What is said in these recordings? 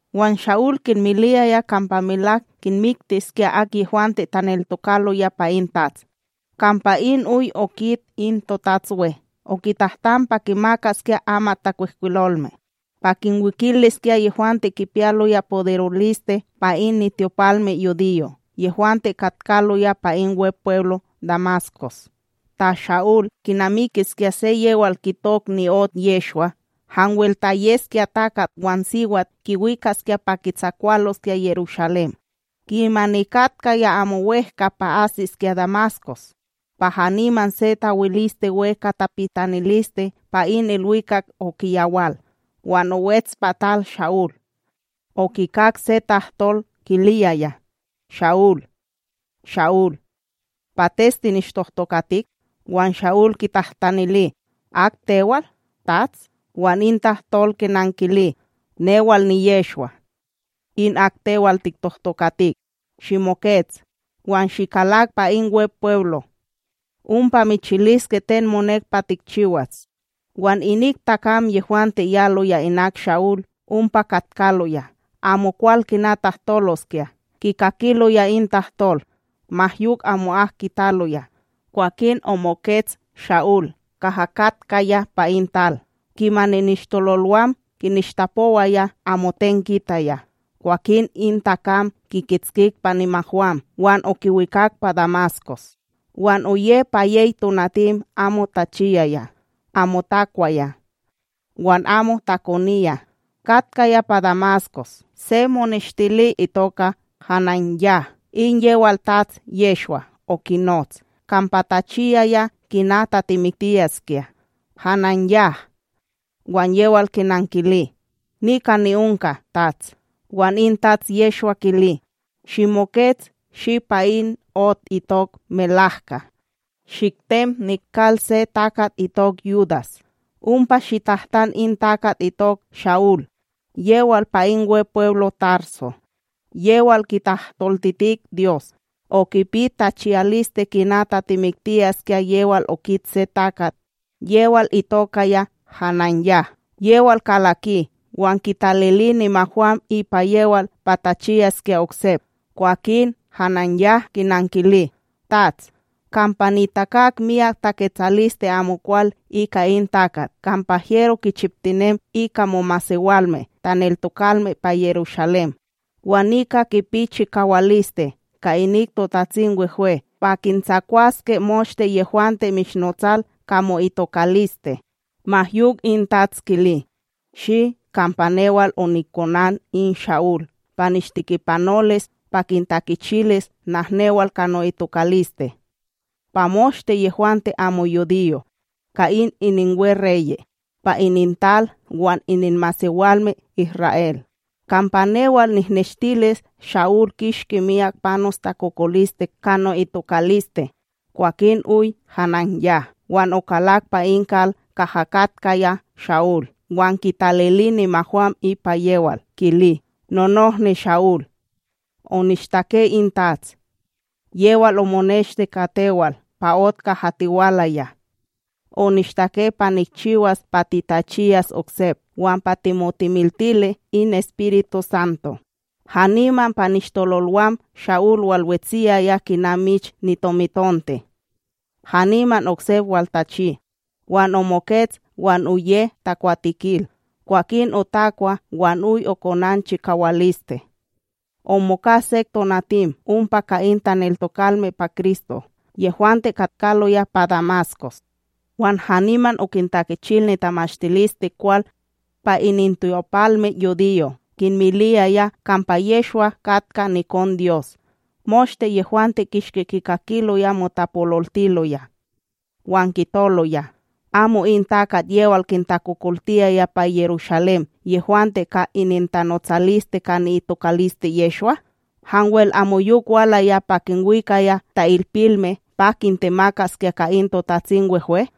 Wan Sha'ul kinmiliyaya kampa melak kinmiktiskya ak yehwante taneltokaloya pa in Tats. Kampa in oy okit in totatsWe, okitahtan pa kimakaskya amatTakwihkwilolme, pa kinwikiliskya yehwante kipiyaloya poderoliste pa in nityopalmeYudiyo' yehwante katkaloya pa in Wepweblo Damaskos ta Sha'ul kinamikiskya se yewal kitok ni'ot Yehshwa, hanwel ta yeskya takat wan siwat kiwikaskya pa kitsakwaloskya Yerushalém. Kimani katkaya amo wEhka pa asiskya Damaskos, pa haniman se tawilisteWe ka tapitaniliste pa in ilwikak okiyawal. Wan owets pa tal Sha'ul, okikak se tahtol kiliyaya: —Sha'ul, Sha'ul, Pates tinishtohtokatik? Wan Sha'ul kitahtanili: —Ak tewal, Tats? Wan in tahtol kinankili: —Newal niYehshwa, in ak tewal tiktohtokatik. Shimokets wan shikalak pa in Wepweblo, ompa michiliske ten monek pa tikchiwas. Wan inik takam yehwante yaloya inak Sha'ul ompa katkaloya, amokwal kina tahtoloskya kikakiloya in tahtol ma yok amo'ak kitaloya. Kwakin omokets Sha'ul kaha katkaya pa in tal, kimani nishtololwam kinishtapowaya amoten kitaya. Kwakin in takam kikitskik pa nimahwam wan okiwikak pa Damaskos. Wan oye pa yey tonatim amo tachiyaya, amo takwaya wan amo takoniya. Katkaya pa Damaskos se moneshtili itoka HananYah, in yewal Tats Yehshwa okinots, kampa tachiyaya kina tatimiktiyaskya: —HananYah! Wan yewal kinankili: —Nika ni'onka, Tats. Wan in Tats Yehshwa kili: —Shimokets shi pa in ot itok Melahka, shiktem nikal se takat itok Yudas, ompa shitahtan in takat itok Sha'ul yewal pa in Wepweblo Tarso. Yewal kitahtoltitik Dyos, okipi tachiyaliste kina tatimiktiyaskya yewal okit se takat yewal itokaya HananYah, yewal kalaki wan kitalili nimahwam ipa yewal pa tachiyaskya oksep. Kwakin HananYah, kinankili: —Tats, kampa nitakak miyak taketsaliste amokwal ika in takat kampa hyero kichiptinem ika momasewalme taneltokalme pa Yerushalém. Wan nika kipi chikawaliste ka inik TotatsimWehwe pa kintsakwaskya moshte yehwante mishnotsal ka mo'itokaliste. Ma yok in Tats kili: —Shi, kampa newal onikonan in Sha'ul pa nishtekipanolis pa kintakichilis nahnewal ka no'itokaliste pa moshte yehwante amo yudiyo' ka in ininweReye', pa inintal wan ininmasewalme Isra'El. Kampa newal nikneshtilis Sha'ul kishki miyak panos takokoliste ka no'itokaliste. Kwakin oy HananYah, wan okalak pa in kal kaha katkaya Sha'ul. Wan kitalili nimahwam ipa yewal kili: —Nonohni Sha'ul, onishtake in TATS, yewal omoneshti ka tewal pa ot kaha tiwalaya, onishtake pa nikchiwas pa titachiyas oksep wan pa timotimiltili in EspirituSanto. Haniman pa nishtololwam Sha'ul walwetsiyaya kina mich nitomitonte, haniman oksep waltachi. Wan omokets wan oye takwatekil. Kwakin otakwa wan yok okonan chikawaliste, omoka sek tonatim ompa ka in taneltokalme pa Kristo yehwante katkaloya pa Damaskos. Wan haniman okintakichil nitamashtilisteKwal pa inintyopalmeYudiyo', kinmiliyaya kampa Yehshwa katka nikonDyos. Moshte yehwante kishki kikakiloya motapololtiloya, wan kitoloya: —Amo in takat yewal kintakokoltiyaya pa Yerushalém yehwante ka inintanotsaliste ka ni'itokaliste Yehshwa? Hanwel amoyok walaya pa kinwikaya ta'ilpilme pa kintemakaskya ka in TotatsimWehwe?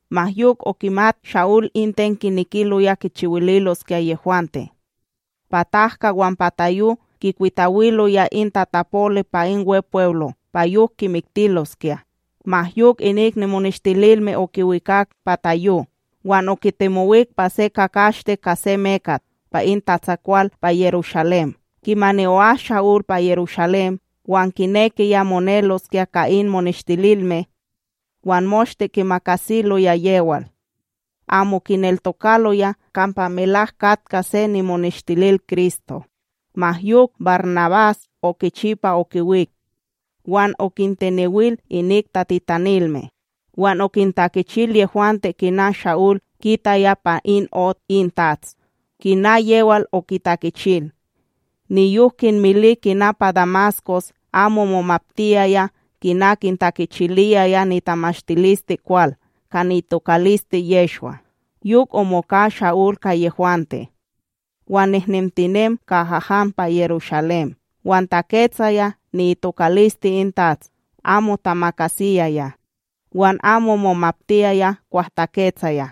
ma yok okimat Sha'ul in ten kinekiloya kichiwililoskya yehwante, pa tahka wan pa tayo kikwitawiloya in tatapoli pa in Wepweblo pa yok kimiktiloskya; ma yok inik nimoneshtililme okiwikak pa tayo wan okitemowik pa se kakashte ka se mekat pa in tatsakwal pa Yerushalém. Kimani o'as Sha'ul pa Yerushalém, wan kinekiya moneloskya ka in moneshtililme; wan moshte kimakasiloya yewal, amo kineltokaloya kampa melak katka se nimoneshtilil Kristo. Ma yok, BarNabás okichi pa okiwik wan okintenewil inik tatitanilme. Wan okintakichil yehwante kina Sha'ul, kitaya pa in ot in TATS kina yewal okitakichil. Niyok kinmili kina pa Damaskos amo momaptiyaya kina kintakichiliyaya nitamashtilisteKwal ka ni'itokaliste Yehshwa. Yok omoka Sha'ul ka yehwante, wan nihnentimen kaha han pa Yerushalém wan taketsaya ni'itokaliste in TATS amo tamakasiyaya. Wan amo momaptiyaya kwah taketsaya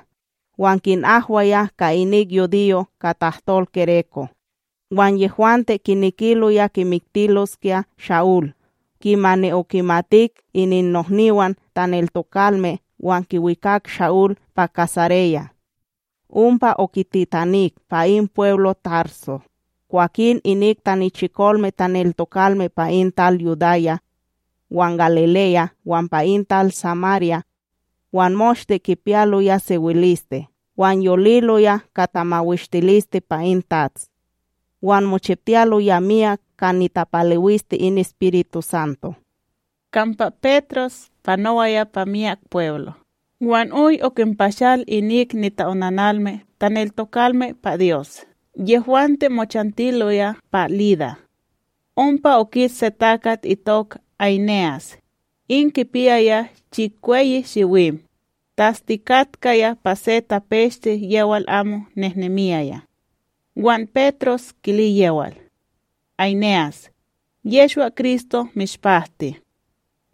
wan kinahwaya ka inik yudiyo' ka tahtol gereko; wan yehwante kinekiloya kimiktiloskya Sha'ul. Kimani okimatik ininnohniwan taneltokalme, wan kiwikak Sha'ul pa Kaysareya, ompa okititanik pa in pweblo Tarso. Kwakin inik tanichikolme taneltokalme pa in tal Yudaya, wan Galileya wan pa in tal Samarya, wan moshte kipiyaloya sewiliste wan yoliloya ka tamawishtiliste pa in TATS, wan mochiptiyaloya miyak ka nitapalewiste in EspirituSanto. Kampa Petros panowaya pa miyak pweblo' wan oy okinpashal inik nita'onanalme taneltokalme pa Dyos yehwante mochantiloya pa Lida. Ompa okit se takat itok Áyne'as, in kipiyaya chikweyi shiwim, tastikatkaya pa se tapeshte yewal amo nehnemiyaya. Wan Petros kili yewal: —Áyne'as, Yehshwa-Kristo mishpahti.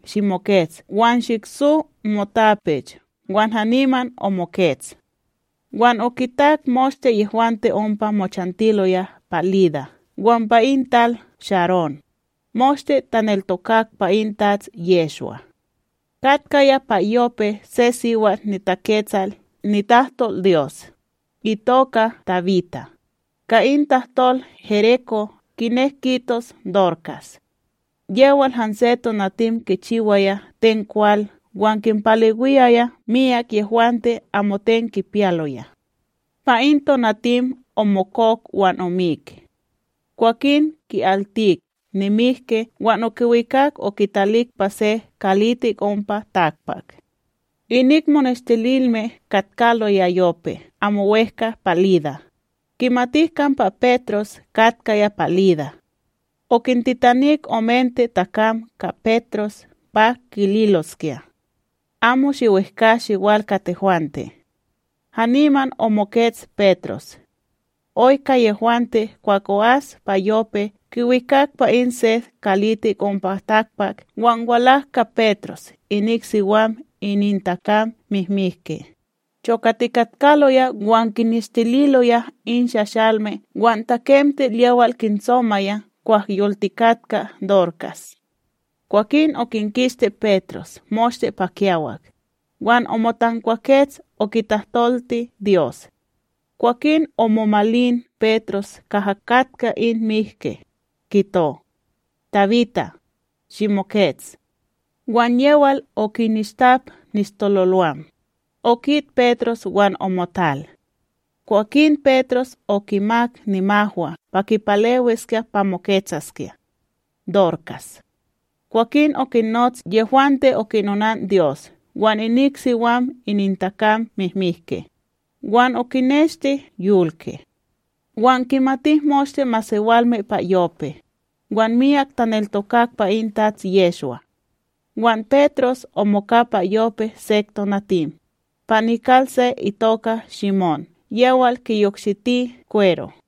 Shimokets wan shikso motapech wan haniman omokets. Wan okitak moshte yehwante ompa mochantiloya pa Lida wan pa in tal Sharón, moshte taneltokak pa in Tats Yehshwa. Katkaya pa Yope se siwat niTaketsal nitahtolDyos, itoka Tabita, ka in tahtol gereko kinek kitos Dorkas. Yewal hanse tonatim kichiwaya ten kwal wan kinpalewiyaya miyak yehwante amoten kipiyaloya. Pa in tonatim omokok wan omik; Kwakin ki'altik nimihki wan okiwikak okitalik pa se kalitik ompa takpak. Inik moneshtililme katkaloya Yope amo wEhka pa Lida, kimatik kampa Petros katkaya pa Lida; okintitanik omente takam ka Petros pa kililoskya: —Amo shiwehkA shiwal ka tehwante. Haniman omokets Petros. Oy ka yehwante kwah o'as pa Yope kiwikak pa in se kalitik ompa takpak wan walak ka Petros inik siwam inintakam mihmihke, chokatikatkaloya wan kineshtililoya in shashalme wan takemtil yewal kintsomaya kwah yoltikatka Dorkas. Kwakin okinkisti Petros moshte pa kiyawak, wan omotankwakets okitahtolti Dyos; kwakin omomalin Petros kaha katka in mihki, kito: —Tabita, shimokets. Wan yewal okinishtap nishtololwam, okit Petros wan omotal. Kwakin Petros okimak nimahwa pa kipalewiskya pa moketsaskya; Dorkas. Kwakin okinnots yehwante okinonanDyos wan inik siwam inintakam mihmihke, wan okineshti yolki. Wan kimatik moshte masewalme pa Yope, wan miyak taneltokak pa in Tats Yehshwa. Wan Petros omoka pa Yope sek tonatim, pa nikal se itoka Shimón yewal kiyokshiti kwero.